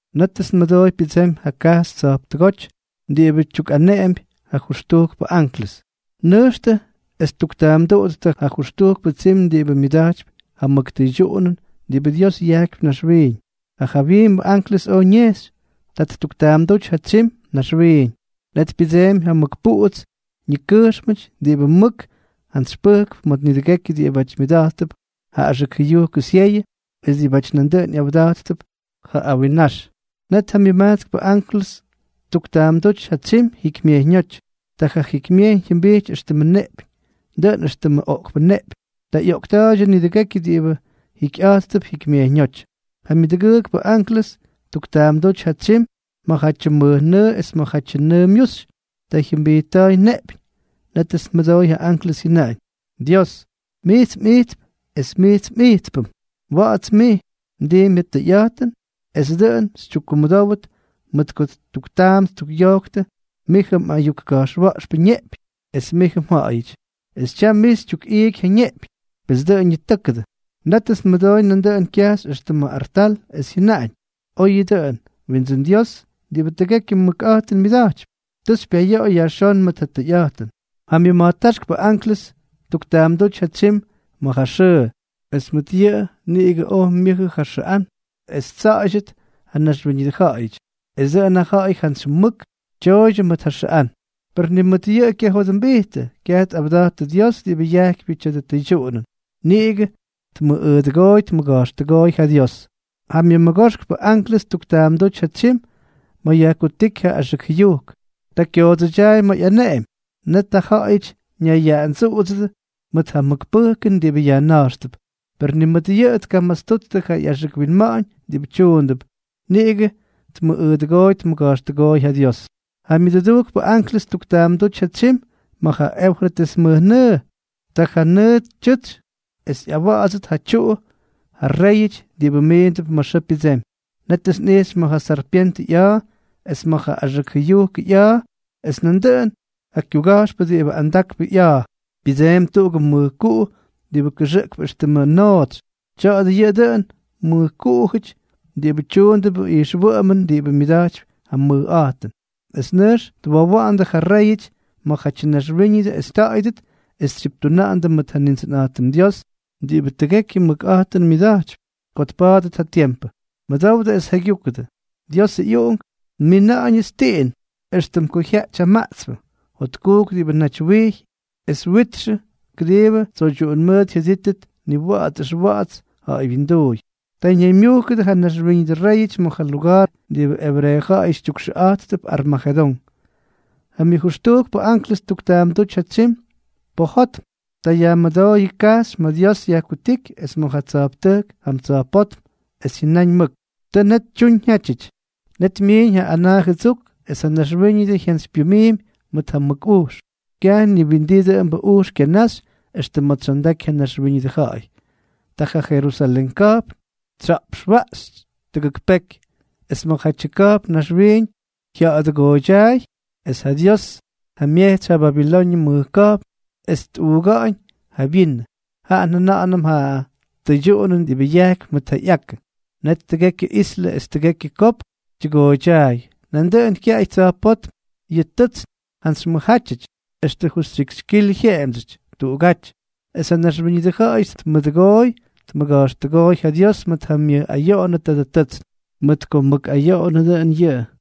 Nétʉts nmʉdooy pyʉdsemy ja kajxy tsa̱jptʉgóty diꞌibʉ tyukꞌaneꞌempy ja jʉxtujkpʉ anklʉs: —Nʉjxtʉ es tuktaamduꞌuttʉ ja jʉxtujkpʉ tsim diꞌibʉ myʉda̱jtypy ja mʉk tʉydyuꞌunʉn diꞌibʉ Dios yajkypy naxwiiñ. Ja jawyiimbʉ anklʉs oj ñejxy. Ta ttuktaamdúty ja tsyim naxwiiñ. Net pyʉdseemy ja mʉk puꞌuts ñikʉjxmʉty diꞌibʉ mʉk jantsy pʉjkp ma̱ nidʉgekyʉ diꞌibáty myʉda̱jttʉp ja axʉk jʉyujkʉ syeyʉ es diꞌibáty nandʉꞌʉn ꞌyawda̱jttʉp ja awinnax. Net ja myʉmajtskpʉ anklʉs ttuktaamdúty ja tsyim jikymyejyñóty. Ta ja jikymyejyñ jyʉmbijty éxtʉmʉ neꞌpyñ, dʉꞌʉn éxtʉmʉ oꞌkpʉ neꞌpyñ. Ta ꞌyoꞌkta̱a̱ydyʉ nidʉgekyʉ diꞌibʉ jikyꞌa̱jttʉp jikymyejyñóty. Ja myʉdʉgʉʉkpʉ anklʉs ttuktaamdúty ja tsyim ma̱jatyʉ mʉjnʉʉ es ma̱jatyʉ nʉʉ myuxy. Ta jyʉmbijtta̱a̱y neꞌpyñ. Nétʉts nmʉdooy ja anklʉs jyʉnaꞌañ: —Dios, mijts mꞌijt es mijts mꞌijtpʉm. Wa̱ꞌa̱ts mij. Mdiimpy ja tʉyꞌa̱jtʉn es dʉꞌʉn xytyukkumʉdówʉt, mʉt ko ttuktaam ttukꞌyojktʉ mijʉ mꞌayuk ka̱jxwa̱ꞌxpʉ ñeꞌpyñ, es mijʉ mja̱ꞌa̱yʉty. Es tyam mij xytyukꞌiiky ja neꞌpyñ. Pes dʉꞌʉn ñitʉ́kʉdʉ. Nétʉts nmʉdooy nandʉꞌʉn kyajxy extʉ ma̱ artal, es jyʉnaꞌañ: —Oyʉ dʉꞌʉn, Windsʉ́n Dios diꞌibʉ tʉgekyʉ mʉkꞌa̱jtʉn myʉda̱jtypy. Tʉ xypyayoꞌoy yajxón mʉt ja tʉyꞌa̱jtʉn. Ja myʉma̱jtáxkpʉ anklʉs ttuktaamdúty ja tsyim ma̱ ja xʉʉ. Es mʉt yʉꞌʉ niꞌigʉ oj myʉjʉ ja xʉꞌán es ttsa̱ꞌa̱ydyʉt ja naxwíñʉdʉ ja̱ꞌa̱yʉty. Es dʉꞌʉn ja ja̱ꞌa̱y jantsy mʉk tyooydyʉ mʉt ja xʉꞌán. Per ni mʉt yʉꞌʉ kyajodʉmbijttʉ, kyaj tꞌawda̱jttʉ Dios diꞌibʉ yajkypyʉ tya̱dʉ tʉydyuꞌunʉn. Niꞌigʉ tmʉꞌꞌʉdʉgooy tmʉga̱jxtʉgooy ja Dios. Ja myʉmʉgoxkpʉ anklʉs ttuktaamdúty ja tsyim ma̱ yajkutíky ja axʉk jʉyujk. Ta kyoodsʉdyaay ma̱ ꞌyaneꞌemy. Net ja ja̱ꞌa̱yʉty ñayyaꞌandsuꞌudsʉdʉ mʉt ja mʉk pʉjkʉn diꞌibʉ yajna̱jxtʉp. Per ni mʉt yʉꞌʉ tkamastuttʉ ja ꞌyaxʉk winma̱ꞌa̱ñ diꞌibʉ tyuundʉp. Niꞌigʉ tmʉꞌꞌʉdʉgooy tmʉga̱jxtʉgooy ja Dios. Ja myʉdʉdujkpʉ anklʉs ttuktaamdúty ja tsyim ma̱ ja Eufrates mʉjnʉʉ. Ta ja nʉʉ tyʉtsy es ꞌyawa̱ꞌa̱dsʉt ja tyuꞌu ja réyʉty diꞌibʉ miindʉp ma̱ xʉʉ pyʉdsemy. Nétʉts nꞌijxy ma̱ ja sarpyentʉ ꞌya̱a̱, es ma̱ ja axʉk jʉyujkʉ ꞌya̱a̱, es ma̱ nandʉꞌʉn ja kyuga̱jxpʉ diꞌibʉ andakpʉ ꞌya̱a̱, pyʉdsemy tʉgʉʉgʉ mʉjkuꞌu diꞌibʉ kʉxʉꞌkp éxtʉmʉ nootsy. Tya̱a̱dʉ yʉꞌʉ dʉꞌʉnʉ mʉjkuꞌujʉty diꞌibʉ tyuundʉp ijxwʉꞌʉmʉn diꞌibʉ myʉda̱jtypy ja mʉjꞌa̱jtʉn, es nʉjx twowa̱ꞌa̱ndʉ ja réyʉty ma̱jatyʉ naxwíñʉdʉ es ñaymyujkta̱ꞌa̱yʉdʉt es tsyiptuna̱ꞌa̱ndʉ mʉt ja Nindsʉnꞌa̱jtʉm Dios diꞌibʉ tʉgekyʉ mʉkꞌa̱jtʉn myʉda̱jtypy, ko tpa̱a̱dʉt ja tiempʉ. “Mʉdowdʉ es jaygyúkʉdʉ. Ʉj, Diosʉ ꞌyUꞌunk, nmina̱ꞌa̱ñʉts tiꞌin, éxtʉm ko jyaꞌty ja maꞌtspʉ. Jotkujk diꞌibʉ naty wijy es witxʉ, kʉdiibʉ tsoydyuꞌun mʉʉt jyʉdítʉt niwa̱ꞌa̱ts ʉxwa̱ꞌa̱ts ja̱ꞌa̱y wyinduuy.” Ta ñaymyujkʉdʉ ja naxwíñʉdʉ réyʉty ma̱ ja luga̱a̱r diꞌibʉ ebreeʉ ja̱ꞌa̱yʉty tyukxʉꞌa̱jttʉp Armajedón. Ja myʉjʉxtujkpʉ anklʉs ttuktaamdúty ja tsyim pojotm. Ta yajmʉdooy kajxy ma̱ Dios yajkutíky es ma̱ ja tsa̱jptʉjk jam tsa̱jpótm, es jyʉnáñ mʉk: —¡Tʉ net tyuñ jyátyʉty! Net myiiñ ja anaa jʉdsuk, es ja naxwíñʉdʉ jyantsypyʉmiimy mʉt ja mʉk ujx. Kyaj ni windii dʉꞌʉmbʉ ujx kyanaxy extʉ ma̱ tsyondaky ja naxwíñʉdʉ ja̱ꞌa̱y. Ta ja Jerusalén ka̱jpn tsya̱ꞌpxwaꞌxy tʉgʉk peky. Es ma̱jatyʉ ka̱jpn naxwiiñ jya̱ꞌa̱dʉgooydyaay. Es ja Dios tjamyejtsy ja Babiloñʉ mʉj ka̱jpn es ttukꞌuuga̱ꞌa̱ñ ja vyinʉ, jaꞌa njʉna̱ꞌa̱nʉm ja tʉydyuꞌunʉn diꞌibʉ yajkypy mʉt ja ꞌyakʉ. Net tʉgekyʉ islʉ es tʉgekyʉ kopk tyʉgooydyaay. Nandʉꞌʉn kyaꞌay tsa̱jpótm yʉ tʉtsn jantsy mʉjjátyʉty, extʉ justyikxy kilʉ jyeꞌemdsyʉty tuꞌugáty. Es ja naxwíñʉdʉ ja̱ꞌa̱yʉty tmʉꞌꞌʉdʉgoy tmʉga̱jxtʉgóy ja Dios mʉt ja myʉj ayoꞌonʉ tadʉ tʉtsn, mʉt ko mʉk ayoꞌonʉ dʉꞌʉn yʉꞌʉ.